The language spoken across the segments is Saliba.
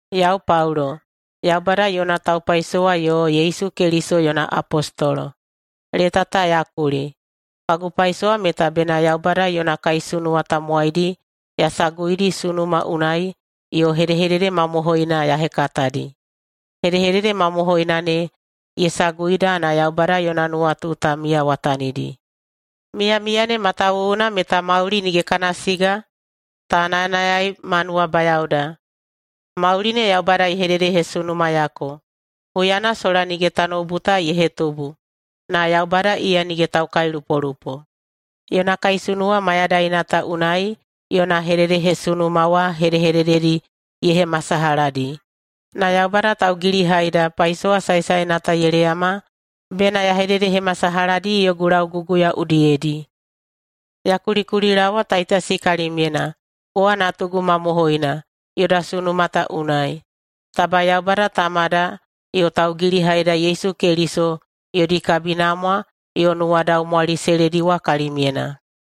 Yau Paulo, Yaubada yona taupaisowa yo Yesu Keliso yona apostolo, leta ta ya kuli. Kagu paisowa meta bena Yaubada yona kaisunuwa tamowaidi ya saguidi sunuma unai yo hedehedede mamohoina ya hekatadi. Hedehedede mamohoina ne ye saguida na Yaubada yona nuwatu ta miyawatanidi. Miyamiya ne matawuwuna meta mauli nige kana siga ta nayanayai ma nuwabayaoda. Mauli ne Yaubada ye hededehesunumayako, huyana sola nige tanoubu ta ye hetubu. Na Yaubada iya nige taukailupolupo! Yona kaisunuwa mayadaina ta unai yona hededehesunuma wa hedehedededi ye hemasalahadi. Na Yaubada Taugilihaida paisowa saesaena ta ye leyama bena ya hededehemasalahadi yogu lauguguya udiyedi. Ya kulikulilaowa Taitasi kalimyena, kowa natugu mamohoina yoda sunuma ta unai. Taba Yaubada Tamada yo Taugilihaida Yesu Keliso yodi kabinamwa yo nuwadaumwali se lediwa kalimyena.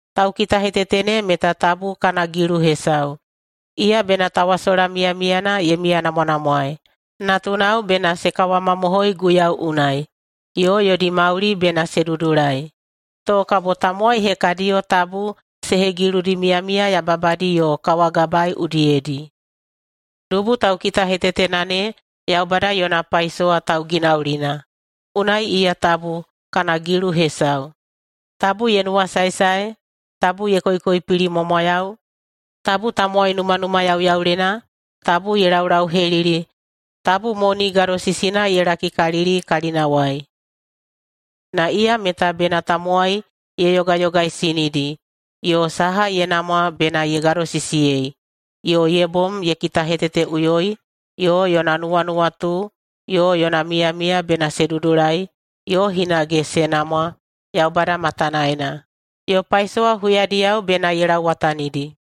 Taukitahetete ne meta tabu kana gilu hesau. Iya bena tawasola miyamiyana ye miyanamwanamwae. Natunao bena se kawamamohoi Guiyau unai, yo yodi mauli bena se dudulai, to kabo tamowai hekadiyo tabu se hegiludi miyamiya yababadi yo kawagabae udiyedi. Dubu taukitahetetena ne Yaubada yona paisowa tauginaulina. Unai iya tabu kana gilu hesau. Tabu ye nuwasaesae, tabu ye koikoipilimwamwayau, tabu tamowai numanumayauyaulena, tabu ye laulauhelili, tabu moni gadosisina ye lakikalili kalinawai. Na iya meta bena tamowai ye yogayogaisinidi, yo saha ye namwa bena ye gadosisiyei, yo ye bom ye kitaheteteꞌuyoi, yo yona nuwanuwatu yo yona miyamiya bena se dudulai yo hinage se namwa Yaubada matanaena, yo paisowa huyadiyao bena ye lauwatanidi.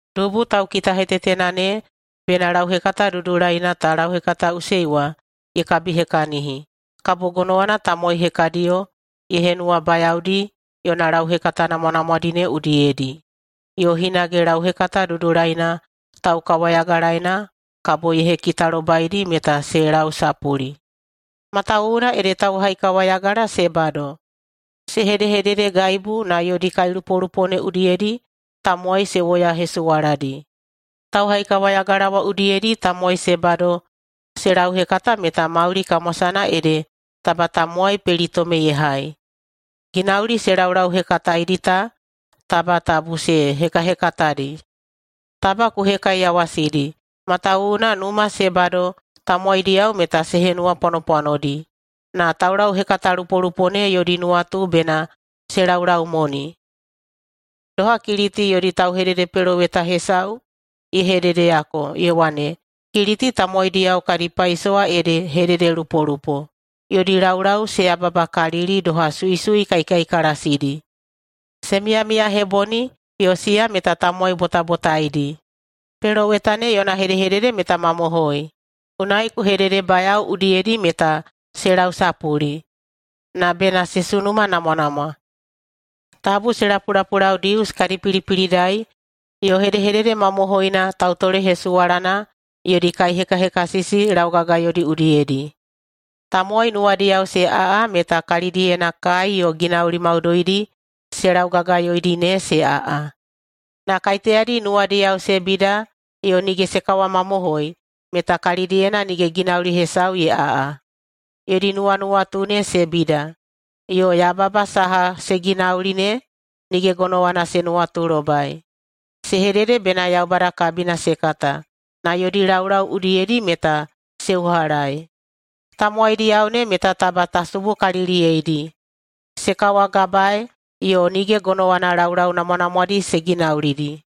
Dubu taukitahetetena ne bena lauhekata dudulaina ta lauhekataꞌusei wa ye kabihekahini, kabo gonowana tamowai hekadiyo ye henuwabayaodi yona lauhekata namwanamwadi ne udiyedi, yo hinage lauhekata dudulaina taukawayagalaena kabo ye hekitalobaidi meta se lausapuli. Matawuwuna ede tauhaikawayagala se bado. Se hedehededegaibu na yodi kailupolupo ne udiyedi tamowai se woyahesuwaladi. Tauhaikawayagala wa udiyedi tamowai se bado se lauhekata meta mauli kamwasana ede taba tamowai pelitome ye hai. Ginauli se laulauhekataedi ta taba tabu se hekahekatadi. Taba ku hekaiyawasidi, matawuwuna numa se bado tamowaidiyao meta se henuwapwanopwanodi. Na taulauhekatalupolupo ne yodi nuwatu bena se laulaumoni. Doha Kiliti yodi tauhededepeloweta hesau ye hededeyako, ye wane, “Kiliti tamowaidiyao kadi paisowa ede hededelupolupo. Yodi laulau se yababakalili doha suisui kaikaikalasidi. Se miyamiyaheboni, yo siya meta tamowai botabotaidi.” Peloweta ne yona hedehedede meta mamohoi. Unai ku hededebayao udiyedi meta se lausapuli, na bena se sunumanamwanamwa. Tabu se lapulapulau Dius kadi pilipilidai yo hedehedede mamohoina tautolehesuwalana yodi kaihekahekasisi laugagayodi udiyedi. Tamowai nuwadiyao se aꞌa meta kalidiyena kai yo ginauli maudoidi se laugagayoidi ne se aꞌa. Na kaiteyadi nuwadiyao se bida yo nige se kawamamohoi, meta kalidiyena nige ginauli hesau ye aꞌa. Yodi nuwanuwatu ne se bida, yo yababa saha se ginauli ne nige gonowana se nuwatulobai. Se hedede bena Yaubada kabina se kata, na yodi laulau udiyedi meta se uhalaei. Tamowaidiyao ne meta taba ta subukaliliyeidi. Se kawagabae, yo nige gonowana laulau namwanamwadi se ginaulidi.